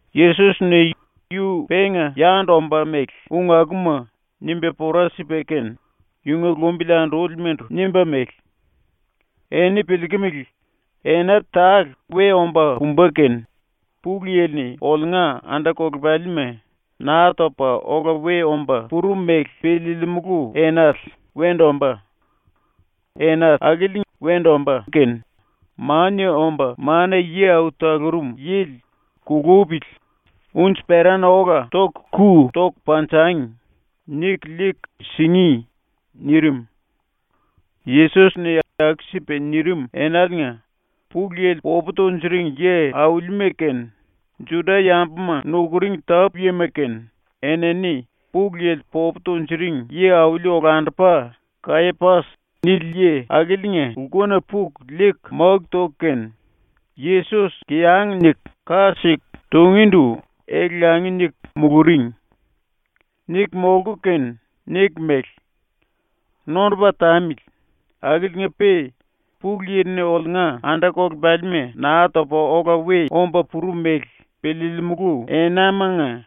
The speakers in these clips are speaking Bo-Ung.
Yesos-ni ⸤yu penga yandu ombá mele⸥ ung akuma nimba pora sipa kene yunga lumbili andúlimandu nimba mele: “Eni piliikimili, ena tale we omba pumba kene Pulu Yili-ni oliunga anda-kolepalima Naa Topa Ola We Omba Purum Mele Piliilimulu Enale wendu ombá. Ena akili wendu ombá kene Mania Omba Mana-Yi Au Talurum Yili “Kulupili unji-perana ola ⸤toku⸥ ku toku panjangi.” niku liiku singí.” nirim. Yesos-ni aku-sipa nirim enaliinga Pulu Yili popu tunjuring yi-aulima kene, Juda-yambuma nukuring tápu-yima kene, enini Pulu Yili popu tunjuring yi-auli-olandupa ‘Kayapas’ nili yi akiliinga lkuna puku liiku máku toku kene, Yesos kiyang niku ka siku tungíndu ele-langi niku muluring. Niku molku kene niku mele: “⸤Nondupa tamili,⸥ akiliinga-pe Pulu Yili-ni oliunga anda-kolepalima Naa Topa Ola We Omba Purum Mele Piliilimulu Enamanga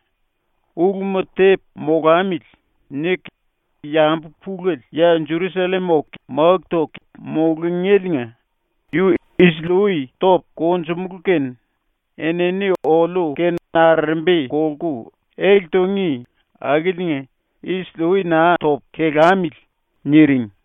⸤‘luma tepu molamili.’ niku⸥ yambu pulele ya Jerusallem oku máku toku mulungéliinga yu isili-ui topu konjumulú kene enini oliu-kene arerembi kolku ele tungí akiliinga isili-ui naa topu, kelamili.” niring.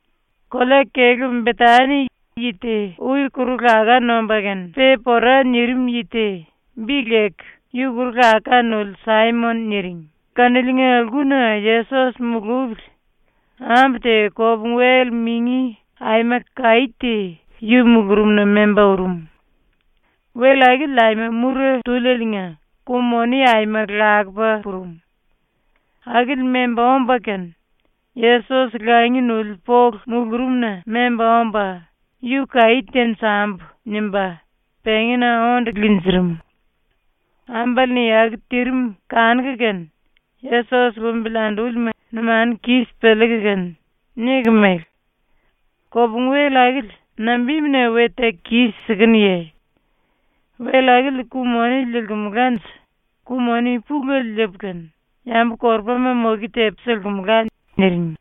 Kolea-kelú Betani yi te ui kuru-laká nomba kene pe pora nirim yi te, bi leku “Yi Kuru-Laká Nuli Saimon” niring kaniliinga lkuna Yesos mulupili ambu te kopungu-wel mingi aima kaí te yu mulurumna memba urum. Wel akili aima mura túlieliinga ku-moni aima lakupa purum. Akili memba omba kene Yesos langi nuli polu mulurumna memba omba ⸤‘Yu kaí tenjambu.’ nimba⸥ pengína onde linjirim. Ambale-ni aku tirim kanuku kene Yesos lumbili andúlima numanu kis piliiku kene niku mele: “Kopungu-wel akili nambimuna we teku kis-sikenuye? Wel akili ku-moni liilkumulanje ku-moni pulele liipu kene yambu-korupama moke tepu silkimula.” niring.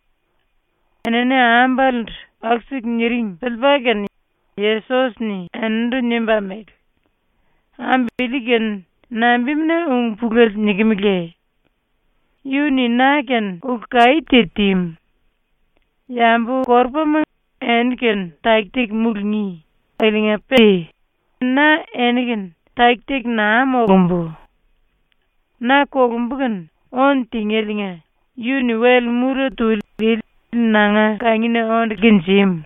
⸤Enini ambalendu⸥ aku-siku ⸤niring⸥ piliipa kene Yesos-ni eninindu nimba mele: “Ambu ili-kene nambimuna ung pulele nikimeleye? Yu-ni na-kene ulu kaí te tímu. Yambu-korupama eni-kene taki-taki mulungí akiliinga-pe na eni-kene taki-taki naa molumbu. Na ⸤kolumbu kene⸥ ónu tingéliinga yu-ni wel mura tuli ili nanga kangina onde linjímu.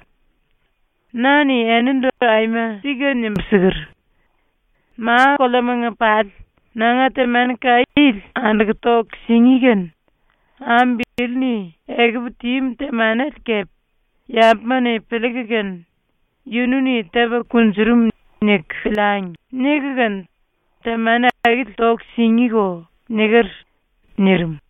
Na-ni enindu aima sika nimbu siker: “Ma-koleamanga pali ⸤nanga⸥ temani kaí ili anduku toku singí kene ambu ili-ni ekupu tímu temanele kepe ‘Yambuma-ni piliiku kene ‘Yunu-ni tepa kunjurum.’ niku piliangi.’ niku kene temani akili toku singíko.” niker.” nirim.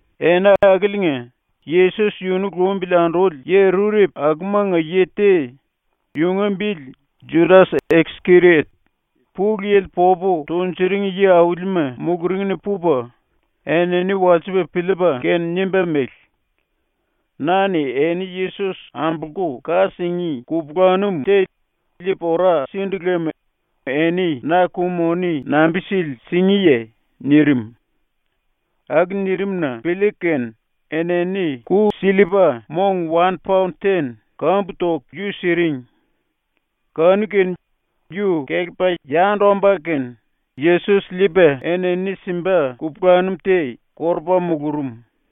Ena akiliinga Yesos yunu lumbili anduli yi rurepu akumanga yi te, yunga bili Judas-Iskeriot, Pulu Yili popu tunjuring yi-aulima muluringna pupa, enini walsipa piliipa kene nimba mele: “Na-ni eni Yesos ambolku ka singí kupulanum te liipu ora sindu lem eni na ⸤ku-moni⸥ nambi-sili singíye?” nirim. ⸤Aku nirim-na piliiku kene⸥ enini ku-sillipa mong wan-paon-ten kambu toku yu siring. Kanu-kene yu kelepa yandu omba kene Yesos liipa enini simba kupulanum te korupa mulurum.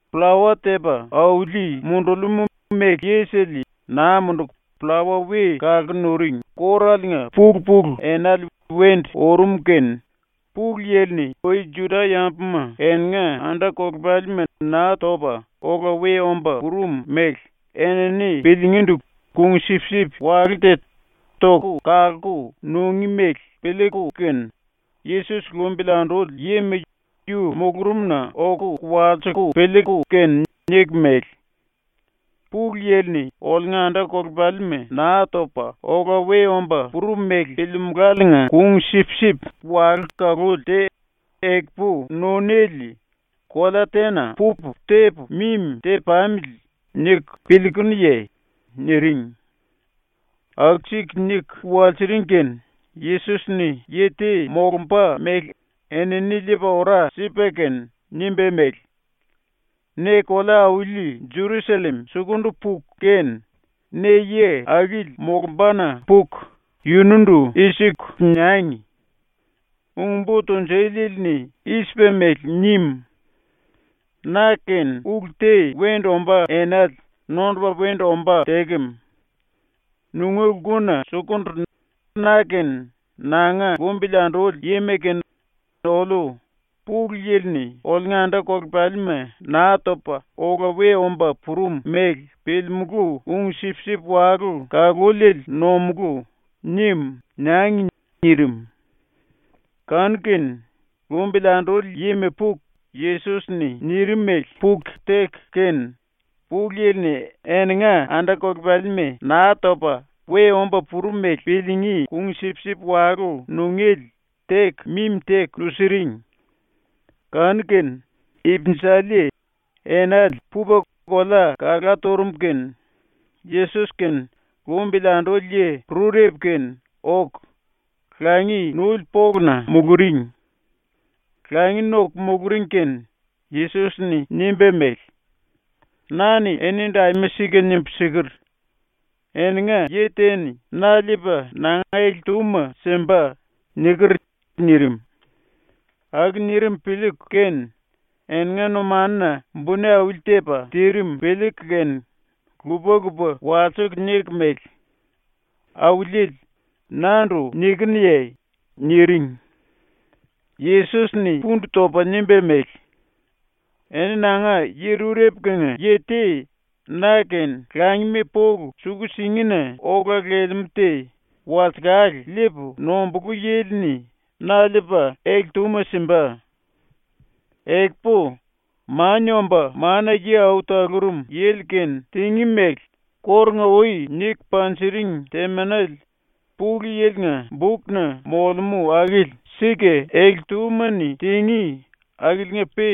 Pllawa Tepa Auli Mundulimú Méle Yisele Naa Munduku Pllawa We Kalku Nuring Kóraliinga pulu-pulu enale wendu urum kene ⸤Pulu Yili-ni ui Juda-yambuma eninga anda-kolepalima Naa Topa Ola We Omba Purum mele enini piliingíndu kung-sipsip walú te toku kalku nungí mele piliiku kene,⸥ Yesos lumbili anduli yima yu mulurumna oku walsiku piliiku kene niku mele: “Pulu Yili-ni oliunga anda-kolepalima Naa Topa Ola We Omba Purum mele piliimuláliinga kung-sipsip walú ⸤kaluli⸥ te ekupu nunéle kolea tena pupu tepu mimi te-pamili niku piliikunuye?” niring. ⸤Aku-siku niku walsiring kene⸥ Yesos-ni ⸤yi te molumba mele enini liipa ora sipa kene⸥ nimba mele: “Ne kolea-auli ⸤Jerusallem⸥ sukundu puku kene, ne yi akili molumbana puku yunundu i-siku niangi: “Ung-Bo Tunjuliele-ni i-sipa mele nim: “Na-kene ulu te wendu ombá enale nondupa wendu ombá tekem. Nunga lkuna sukundu na kene nanga lumbili anduli yima kene oliu Pulu Yili-ni oliunga anda-kolepalima Naa Topa Ola We Omba Purum mele piliimulú kung-sipsip walú ⸤kaluliele⸥ nomulú,” nim,” niangi,” nirim. Kanu-kene lumbili anduli yima puku Yesos-ni nirim mele puku teku kene, Pulu Yili-ni eninga anda-kolepalima Naa Topa We Omba Purum mele piliingí kung-sipsip walú nungéle teku mimi teku nusiring. Kanu-kene, ipinjali enale pupa kolea kalá turum kene Yesos kene lumbili anduli yi rurepu kene ⸤oku⸥ langi nuli poluna muluring. Langi noku muluring kene Yesos-ni nimba mele: “Na-ni enindu aima sika nimbu siker: “Eninga yi te-ni na liipa nanga ele-túma simba.” niker.” nirim. ⸤Aku nirim piliiku kene⸥ eninga numanuna buni auli-tepa tirim piliiku kene lupa-lupa walsiku niku mele: “Auliele, nandu nikinuye?” niring. Yesos-ni pundu topa nimba mele: “⸤Eni nanga yi rurepu-kenga⸥ yi te na-kene langima polu suku-singina ola lelemú te walsekale liipu nombulú yili-ni na liipa, ele-túma simba. Ekupu Mania Omba Mana-Yi Au Talurum Yili-kene tingí mele kórunga-ui niku panjiring temanele ⸤Pulu Yili-nga⸥ bukna molemú akili sika ele-túma-ni tingí, akiliinga-pe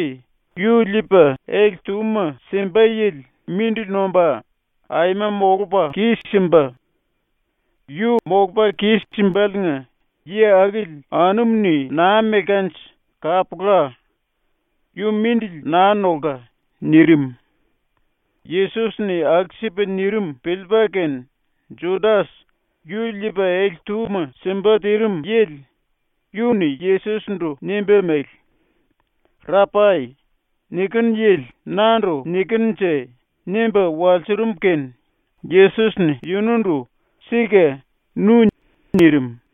yu liipa ele-túma simba yili mindili nomba aima molupa kis-simba. Yu molupa kis-simbaliinga yi akili anumu-ni naa melkanje kapula. Yu mindili naa nolka.” nirim. Yesos-ni aku-sipa nirim piliipa kene Judas, yu liipa ele-túma simba tirim yili, yu-ni Yesos-ndu nimba mele: “Rapai, nikinu yili nandu nikinunje?” nimba walsurum kene Yesos-ni yunundu “Sika, nu.” nirim.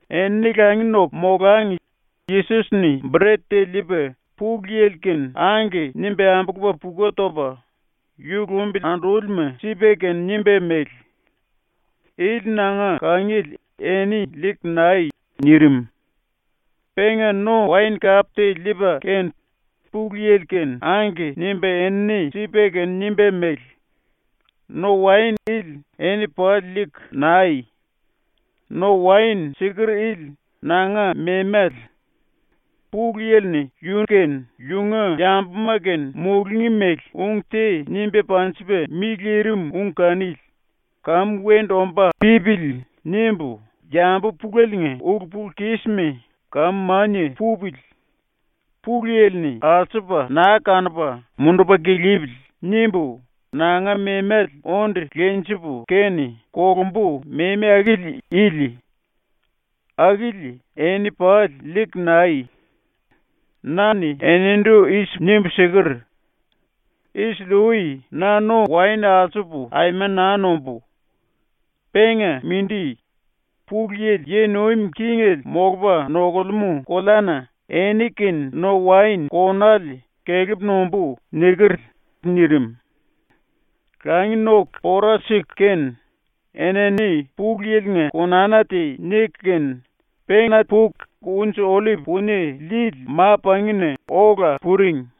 Enini langi noku molangi Yesos-ni bret te liipa Pulu Yili-kene “Angke” nimba ambulupa puku topa yu lumbili andúlima sipa kene nimba mele: “Ili nanga kangiele eni liiku nai.” nirim. Penga no-waen-kap te liipa kene Pulu Yili-kene “Angke” nimba enini sipa kene nimba mele: “⸤No-waen ili⸥ eni pali liiku nai. ⸤No-waen⸥ siker ili nanga memale. Pulu Yili-ni ⸤yu kene yunga yambuma kene mulungí mele⸥ ung te nimba panjipa mi lirim ung kanili ‘Kamu wendu omba pípili.’ nimbu ‘Yambu puleliinga ulu-pulu-kisma kamu mania pupili. Pulu Yili-ni alsupa naa kanupa mundupa kilipili.’ nimbu nanga memale onde lenjipu kene ⸤kolumbu⸥ memi akili ili. Akili eni pali liiku nai. Na-ni enindu i-sipu nimbu siker: “Isili-ui na no-waen alsupu aima naa nombú. Penga mindi, Pulu Yili yi nuim kingele molupa nokulemú koleana eni-kene no-waen konale kelepu nombú.” niker.” nirim. ⸤Langi noku pora siku kene⸥ enini Pulu Yili-nga konana te niku kene, pena puku Unji-Ollip Punie Lili Ma-Pangina ola puring.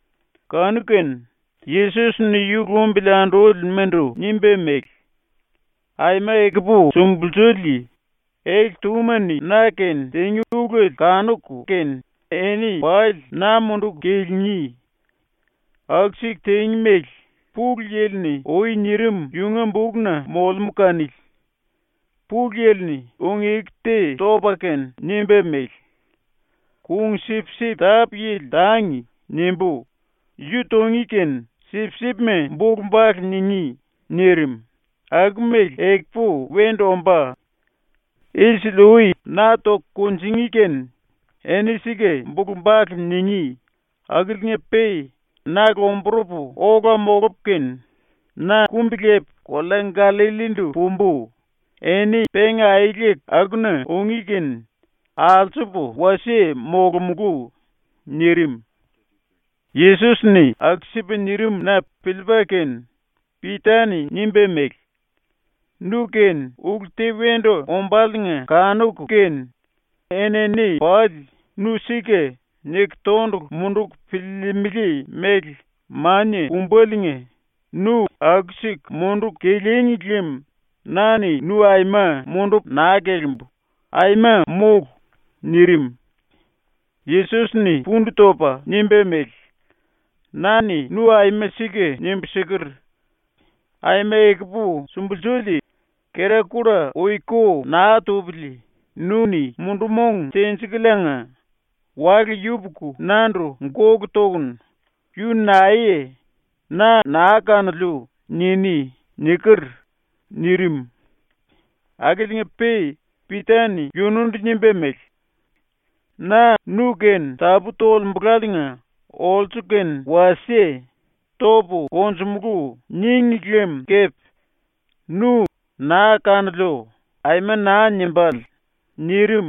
Kanu-kene Yesos-ni yu lumbili andúlimandu nimba mele: “Aima ekupu sumbulsuli ⸤ele-túma-ni⸥ na-kene tingí ulele kanuku kene eni pali na munduku kilingí. ⸤Aku-siku tingí mele⸥ Pulu Yili-ni ui nirim yunga bukna molemú kanili. Pulu Yili-ni ⸤ung-eku te topa kene⸥ nimba mele: “ “Kung-sipsip tápu-yili tangi.” nimbú, yu tungí kene sipsipma bulu-bale ningí.” nirim, ⸤aku-mele ekupu wendu ombá⸥. ⸤Isili-ui na toku kunjingí kene eni sika bulu-bale ningí⸥ akiliinga-pe na lomburupu ola molupu kene, na kumbi-lepu kolea Gallallindu pumbu, ⸤eni penga aeleku akuna ungí kene alsupu wasie molomulú⸥.” nirim. ⸤Yesos-ni aku-sipa nirim-na piliipa kene⸥ Pita-ni nimba mele: “Nu-kene ulu te wendu ombáliinga kanuku kene enini pali ‘Nu sika’ niku tondulu munduku piliilimili mele mania pumbaliinga nu aku-siku munduku kilíngi lem na-ni nu aima mundupu naa kelimbu, aima mólu!” nirim. Yesos-ni pundu topa nimba mele: “Na-ni nu aima sika nimbu siker: “Aima ekupu sumbulsuli, kera-kulla ui ko naa tupili nu-ni ⸤mundu-mong tenjikuliinga⸥ wale yupuku nandu gólu tokunu “Yu naeye. Na naa kanoliu.” niní.” niker.” nirim. Akiliinga-pe Pita-ni yunundu nimba mele: “Na nu-kene tapú tolembulaliinga olsu kene wasie “Topu konjumulú.” níngi lem kepe nu “Naa kanoliu.” aima naa nimbále.” nirim.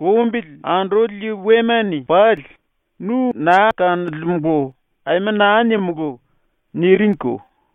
Lumbili anduli yi wema-ni pali “ “Nu naa kanolemulu.” aima naa nimulú.” niringko.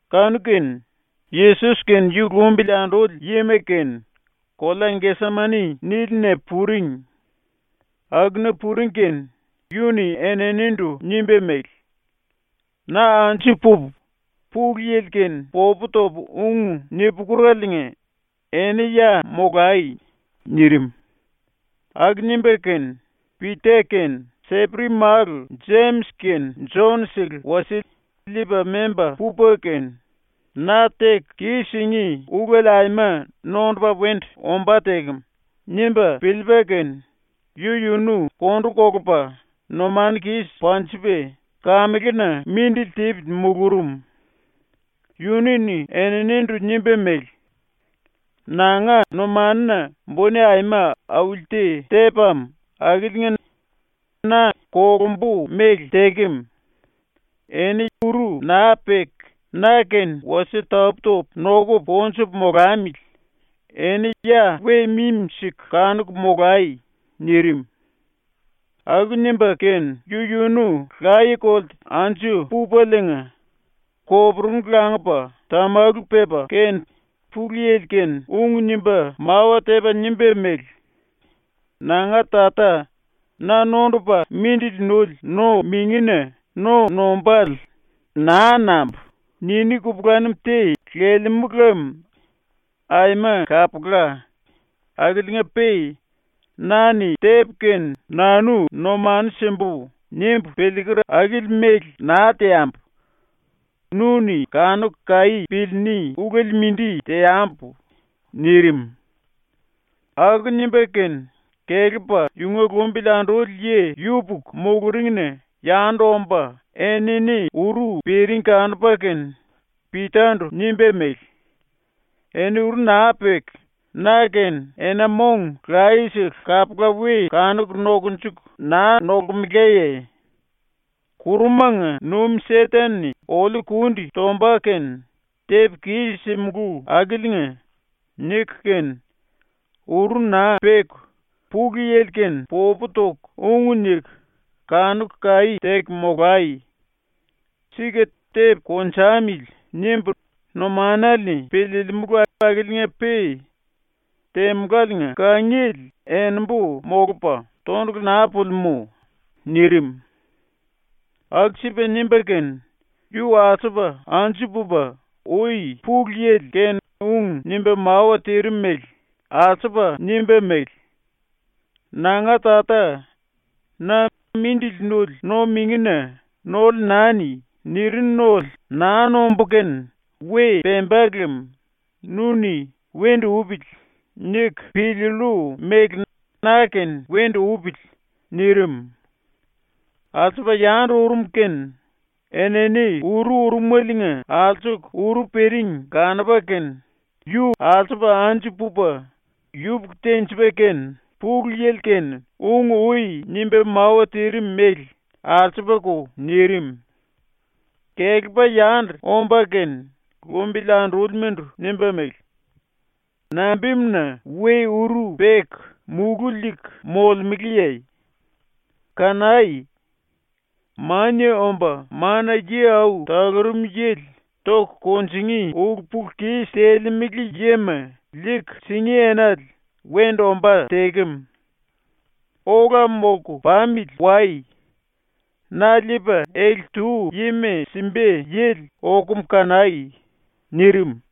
Kanu-kene Yesos kene yu lumbili anduli yima kene kolea ‘Gesemani’ nílina puring. Akuna puring kene yu-ni eninindu nimba mele: “Na anju pupu Pulu Yili-kene popu topu ung ni-pukuraliinga eni ya molai.” nirim. Aku nimba kene Pita kene Seperi-málu ⸤Jemis kene Jon-sele⸥ wasie liipa memba pupa kene ⸤‘Na teku kis-singí ulele aima nondupa wendu ombá tekem.’ nimba piliipa kene⸥ yu-yunu kondu kolupa numanu kis panjipa kamelena mindili tipili mulurum. Yunu-ni eninindu nimba mele: “Nanga numanuna buni aima auli te tepam akiliinga na kolumbu mele tekem. Eni uru naa peku na-kene wasie tapú-topu nokupu konjupu molamili, eni ya we mimi-siku kanuku molai.” nirim. ⸤Aku nimba kene⸥ yu-yunu laye-kolte anju pupaliinga koporungu langupa tamalu pepa kene Pulu Yili-kene ung nimba mawa tepa nimba mele: “Nanga Tata, na nondupa ⸤mindili nuli⸥ no-mingina no nombále ‘Naa nambu.’ niní kupulanum te lelemú lem aima kapula, akiliinga-pe ‘Na-ni tepu kene nanu numanu simbu.’ nimbu piliiker akili mele naa teambu. Nu-ni kanuku kaí piliiní ulele mindi teambu.” nirim. Aku nimba kene kelepa yunga lumbili anduli yi yupuku muluringna yandu omba enini uru piring kanupa kene Pita-ndu nimba mele: “Eni uru naa peku na-kene ena-mong layesele kapula we kanuku nokunjuku naa molkemelaye? ‘⸤Kurumanga nuim Seten-ni⸥ oliu kundi tomba kene tepu kis-simulú akiliinga.’ niku kene ⸤uru naa peku⸥ Pulu Yili-kene popu toku ung niku kanuku kaí teku molai. Sika ‘tepu konjamili.’ nimbu numanale-ni piliilimulu akiliinga-pe temuláliinga kangiele enimbu molupa tondulu naa pulimú.” nirim. Aku-sipa nimba kene yu alsupa anju pupa ui Pulu Yili-kene ung nimba mawa tirim mele alsupa nimba mele: “Nanga Tata, na ‘⸤Mindili nuli⸥ no-mingina nole nani.’ nirinu nole naa nombú kene we pemba lem nu-ni ‘Wendu upili.’ niku piliillu mele na-kene wendu upili.” nirim. Alsupa yandu urum kene enini uru urumeliinga alsuku uru piring kanupa kene yu alsupa anju pupa yupuku-tenjipa kene Pulu Yili-kene ung ui nimba mawa tirim mele alsupako nirim. Kelepa yandu omba kene lumbili andúlimandu nimba mele: “Nambimuna we uru peku múlu liiku molemeleye? Kanai! Mania Omba Mana-Yi Au Talurum Yili ⸤toku kunjingí⸥ ulu-pulu-kis telemele yima liiku singí enale wendu ombá tekem. Ola molku pamili wai! Na liipa ele-tu yima simba yili okum kanai!” nirim.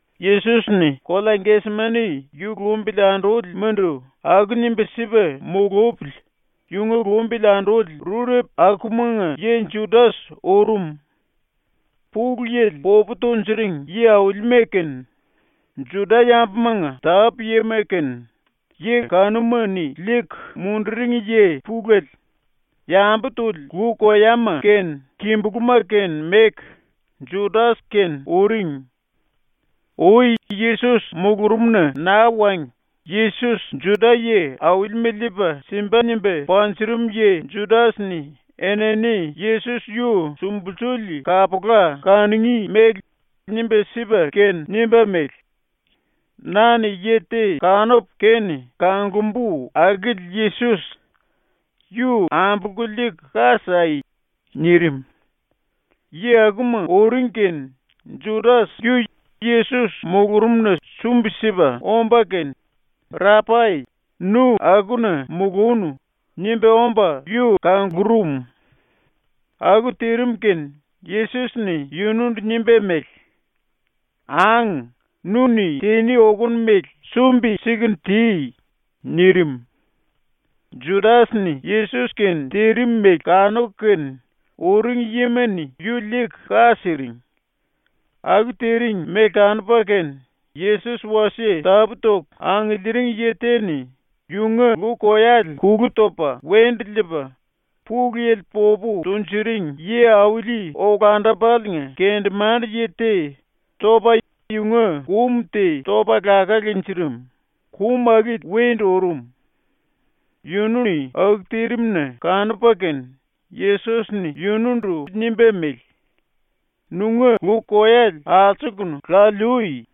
Yesos-ni ⸤kolea Gesemani yu lumbili andúlimandu⸥ aku nimba sipa mulupili yunga lumbili anduli rurepu akumanga yi Judas urum. Pulu Yili popu tunjuring yi-aulima kene, Juda-yambumanga tápu-yima kene, yi kanuma-ni liiku munduring yi pulele, yambu tuli lu-koyama kene kimbulúma kene meku, Judas kene uring. Ui Yesos mulurumna naa wangi Yesos Juda-yi-aulima liipa simba nimba panjurum yi ⸤Judas-ni⸥ enini Yesos yu sumbulsuli kapula kanungí mele nimba sipa kene nimba mele: “Na-ni yi te kanupu kene kanglumbu akili Yesos. Yu ambolku liiku ka sai.” nirim. ⸤Yi akuma⸥ uring kene ⸤Judas⸥ yu Yesos mulurumna sumbi-sipa omba kene “Rapai, nu akuna mulúnu.” nimba omba yu kanglurum. Aku tirim kene Yesos-ni yunundu nimba mele: “Ang, nu-ni tiní okonu mele sumbi-siku ti.” nirim. ⸤Judas-ni Yesos-kene tirim mele⸥ kanuku kene ⸤uring yima-ni⸥ yu liiku ka siring. Aku tiring mele kanupa kene Yesos wasie tapú-toku angiliiring yi te-ni yunga lu-koyale kulu topa wendu liipa Pulu Yili popu tunjuring yi-auli-olandupaliinga kendemande-yi te topa yunga kum te topa laká linjirim, kum akili wendu urum. ⸤Yunu-ni aku tirim-na kanupa kene⸥ Yesos-ni yunundu nimba mele: “Nunga lu-koyale alsuku laliui!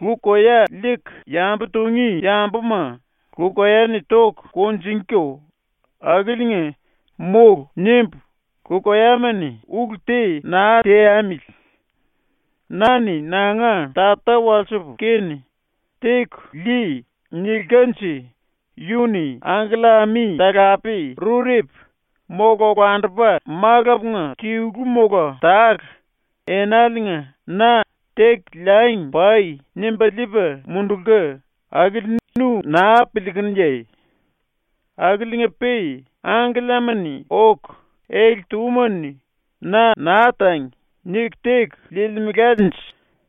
Lu-koya liiku yambu tungí yambuma lu-koya-ni toku kunjingíko, akiliinga ⸤‘Mólu.’ nimbu lu-koyama-ni ulu te naa teamili⸥. Na-ni nanga Tata walsipu kene “Teku lii.” nilkanje yu-ni angkella-ami talape rurepu, mola olandupa malapunga tilu mola tale, enaliinga na “Teku liangi pai.” nimba liipa mundulka akili nu naa piliikunuye? Akiliinga-pe ⸤angkellama-ni oku ele-túma-ni na ‘naa tangi.’ niku teku liilkemelanje⸥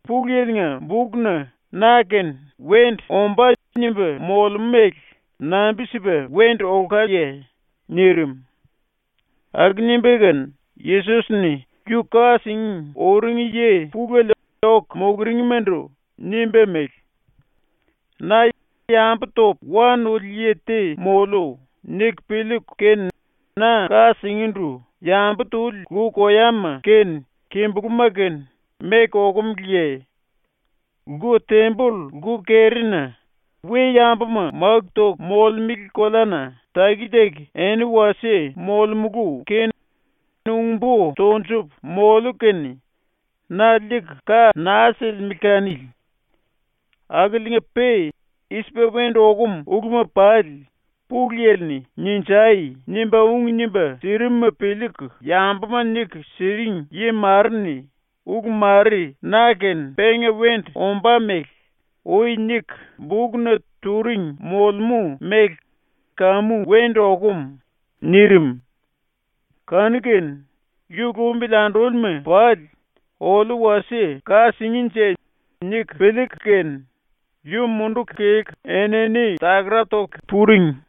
Pulu Yili-nga bukna na-kene wendu ombá nimba molemú mele nambi-sipa wendu olkaye?” nirim. ⸤Aku nimba kene⸥ Yesos-ni ⸤yu ka singí uring⸥ yi pulele oku muluringmandu nimba mele: “Na ‘yambu topu wa nuli yi te moliu.’ niku piliiku kene na ka singíndu yambu tuli lu-koyama kene kimbulúma kene meku okumeleye? Lku-temboll ⸤lku-kerina we-yambuma máku toku molemele⸥ koleana taki-taki eni wasie molemulu kene ung-bo tonjupu moliu kene na liiku ka naa silimele kanili. Akiliinga-pe i-sipa wendu okum uluma pali Pulu Yili-ni “Ninjai!” nimba ung nimba sirimuma piliiku yambuma niku siring yi mare-ni ulu mare ⸤na-kene⸥ penga wendu ombá mele ui niku bukna turing molemú mele kamu wendu okum.” nirim. Kanu-kene yu lumbili andúlima pali ⸤‘Oliu wasie ka singínje.’ niku piliiku kene⸥ yu munduku kelku enini takara toku puring.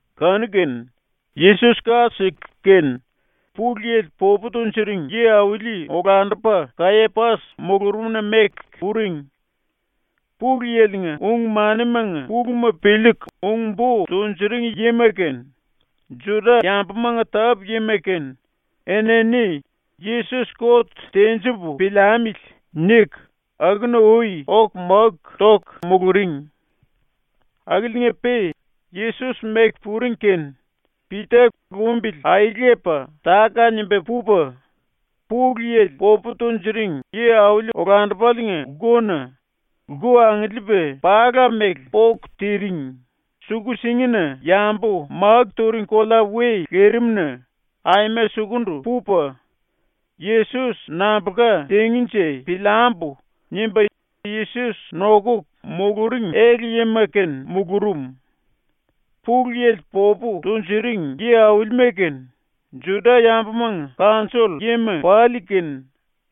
Kanu-kene Yesos ka siku kene Pulu Yili popu tunjuring yi-auli-olandupa Kayapas mulurumna meku puring. Pulu Yili-nga ung-manimanga puluma piliiku ung-bo tunjuring yima kene, Juda-yambumanga tápu-yima kene, enini ⸤‘Yesos kot tenjipu piliamili.’ niku⸥ akuna ui oku máku toku muluring. Akiliinga-pe ⸤Yesos meku puring kene⸥ Pita lumbili aelepa táka-nimba pupa, Pulu Yili popu tunjuring yi-auli-olandupaliinga lkuna, lku angiliipa pala mele póku tirim, suku-singina yambu máku turing kolea we lirimna aima sukundu pupa, ‘Yesos nambulka tingínje piliambu.’ nimba ⸤Yesos nokuku muluring⸥ ele-yima-kene mulurum. Pulu Yili popu tunjuring yi-aulima kene, Juda-yambumanga kanjoll-yima pali kene,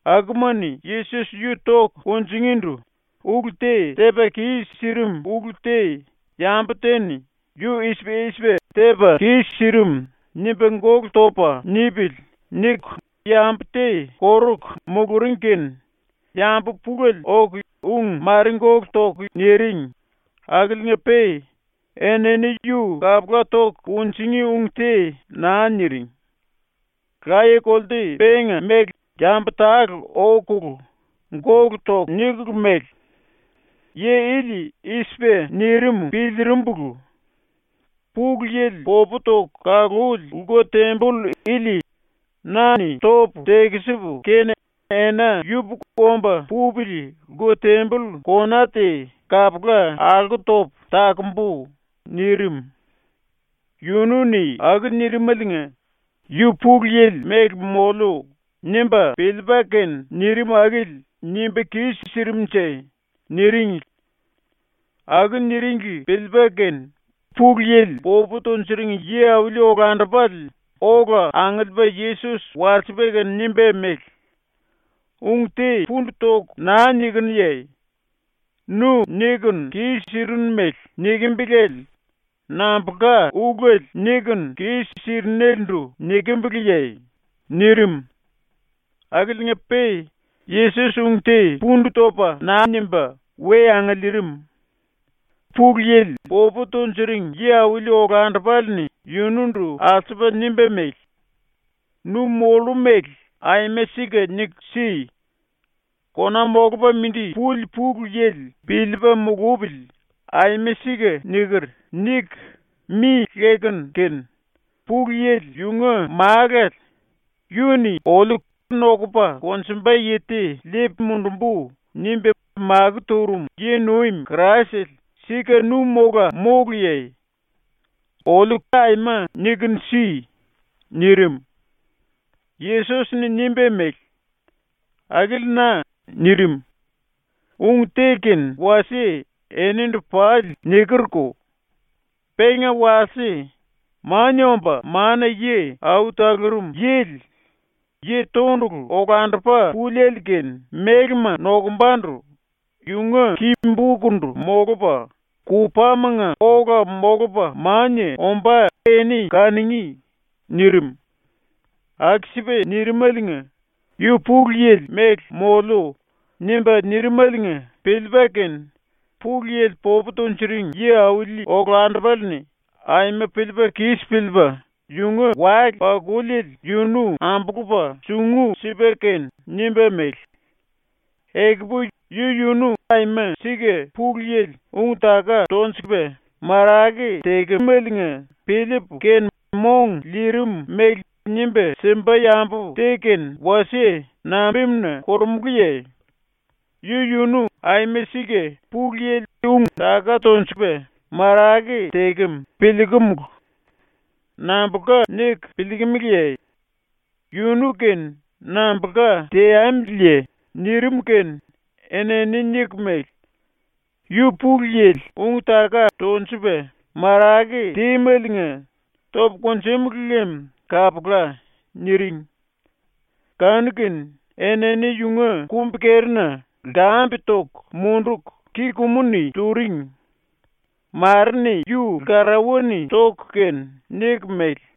akuma-ni Yesos yu toku kunjingíndu ulu te tepa kis-sirim ulu te ‘Yambu te-ni ‘yu i-sipa i-sipa tepa kis-sirim.’ nimba gólu topa nipili.’ niku yambu te koruku muluring kene yambu pulele oku ung mare gólu toku niring akiliinga-pe enini yu kapula toku kunjingí ung te naa niring. Laye-kolte penga mele yambu tale okulu ⸤gólu toku⸥ nikulu mele: “Yi ili i-sipa nirim ⸤piliirimbulu⸥: “Pulu Yili ⸤popu toku kaluli⸥ lku-temboll ili na-ni topu tekisipu kene ena yupuku omba pupili lku-temboll ⸤kona⸥ te kapula alko topu takumbu.” nirim. ⸤Yunu-ni aku nirimaliinga ‘Yu Pulu Yili mele moliu.’ nimba piliipa kene nirim akili nimba kis-sirimnje⸥.” niringli. Aku niringli piliipa kene Pulu Yili popu tunjuring yi-auli-olandupale ola angiliipa Yesos walsipa kene nimba mele: “Ung te pundu toku naa nikinuye? Nu ⸤nikunu kis-sirinu mele⸥ nikimbiliele nambulka ulele nikunu kis-sirinelendu nikimbiliye?” nirim. Akiliinga-pe Yesos ung te pundu topa naa nimba we angiliirim. Pulu Yili popu tunjuring yi-auli olandupale-ni yunundu alsupa nimba mele: “⸤Nu mollu mele aima sika niku si.⸥ Kona Molupa Mindi Puli Pulu Yili piliipa mulupili “Aima sika niker.” niku mi lekunu kene, Pulu Yili yunga Málale, yu-ni oliu “Nokupa konjumba yi te liipu mundumbu.” nimba makó turum yi-nuim Kraisele sika nu mola móluye? Oliu aima nikunu si!” nirim. Yesos-ni nimba mele: “Akili na.” ⸤nirim⸥. “Ung te kene wasie enindu pali nikerko. Penga walse Mania Omba Mana-Yi Au Talurum Yili, Yi Tondulu Olandupa Púliele-⸤kene mélema nokumbandu⸥ yunga ki-bokundu molupa, kupámanga ola molupa mania ombá eni kanungí.” nirim. Aku-sipa nirimaliinga ⸤‘u Pulu Yili mele moliu.’ nimba nirimaliinga⸥ piliipa kene Pulu Yili popu tunjuring yi-auli olandupale-ni ⸤aima piliipa kis piliipa⸥ yunga wale-pakuliele yunu ambulupa sungu sipa kene nimba mele: “Ekupu yu-yunu aima sika Pulu Yili ung-taka tonjukumeliinga piliipu kene mong liirim mele nimba simba yambu te kene wasie nambimuna korumulúye? Yu-yunu aima sika Pulu Yili ung-taka tonjukum piliikumulu. Nambulka niku piliikimiliye? ⸤Yunu-kene nambulka teamiliye?⸥” nirim kene enini niku mele: “Yu Pulu Yili ung-taka tonjupa marake tímeliinga topu kunjúmulu lem kapula.” niring. Kanu-kene enini yunga kumbi-kerina lkambe toku munduku, ki-kumu-ni turing. Mare-ni yu lkarauwa-ni toku kene niku mele: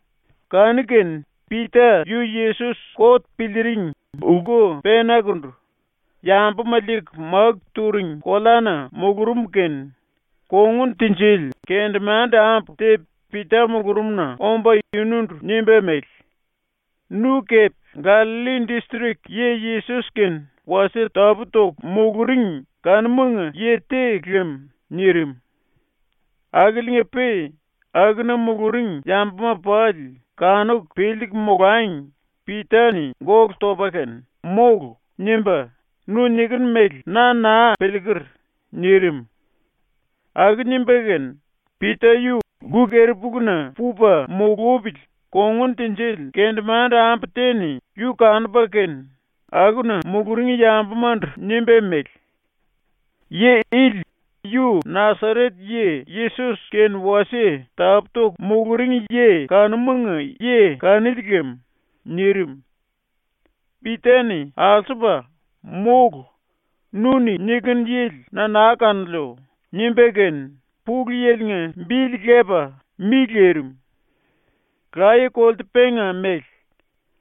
Kanu-kene Pita yu Yesos kot piliiring lku penakundu, yambuma liiku máku turing koleana mulurum kene kongun tinjili kendemande-ambu te Pita mulurumna omba yunundu nimba mele: “Nu kepe Gallalli distrik yi Yesos-kene wasie tapú-toku muluring kanumanga yi te lem.” nirim. Akiliinga-pe akuna muluring yambuma pali kanuku piliiku molangi Pita-ni gólu topa kene “Mólu.” nimba “Nu nikinu mele na naa piliiker.” nirim. Aku nimba kene Pita yu lku-keri-puluna pupa mulupili kongun tinjili kendemande-ambu te-ni yu kanupa kene akuna muluring yambumandu nimba mele: “Yi ili yu Nasaret-yi Yesos kene wasie tapú-toku muluring yi kanumanga yi kanili lem.” nirim. Pita-ni alsupa “Mólu. Nu-ni nikinu yili na naa kanoliu.” nimba kene Pulu Yili-nga bili lepa mi lirim. Laye-kolte penga mele,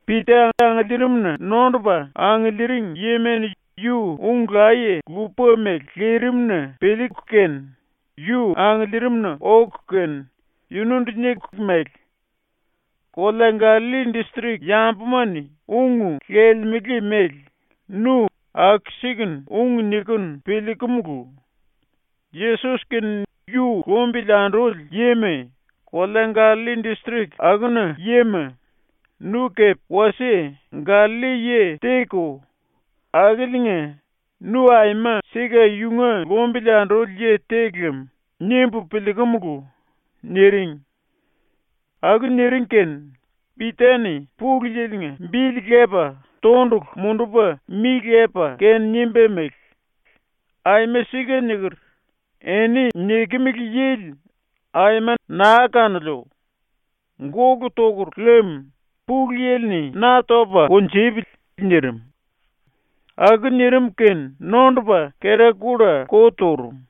Pita angiliirimna nondupa angiliiring yima-ni ⸤yu ung laye lupa mele lirim-na piliiku kene⸥ yu angiliirimna oku kene yunundu niku mele: “Kolea Gallalli distrik yambuma-ni ung lelemele mele nu aku-sikunu ung nikinu piliikumulu. ⸤Yesos kene yu lumbili anduli yima kolea Gallalli distrik akuna yima,⸥ nu kepe wasie Gallalli-yi te-ko, akiliinga ‘Nu aima sika yunga lumbili anduli yi te lem.’ nimbu piliikumulu.” niring. Aku niring kene Pita-ni Pulu Yili-nga bili lepa tondulu mundupa mi lepa kene nimba mele: “Aima sika niker. Eni nikimili yili aima naa kanoliu! Gólu tokur lem Pulu Yili-ni na topa kunjupili.” nirim. Aku nirim kene nondopa kera-kulla ko turum.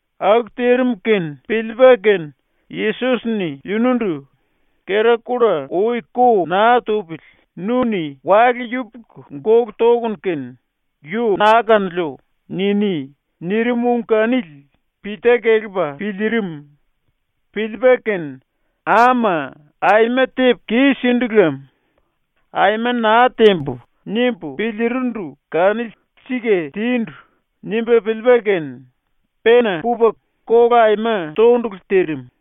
Aku tirim kene piliipa kene Yesos-ni yunundu “Kera-kulla ui ko naa tupili nu-ni wale yupuku gólu tokunu kene “Yu naa kanoliu.” niní.” nirim ung kanili Pita kelepa piliirim. Piliipa kene ⸤‘Ama, aima tepu kis-sindu lam. ‘Aima naa tembu.’ nimbu piliirindu kanili sika tindu.’ nimba piliipa kene⸥ pena pupa kola aima tondulu tirim.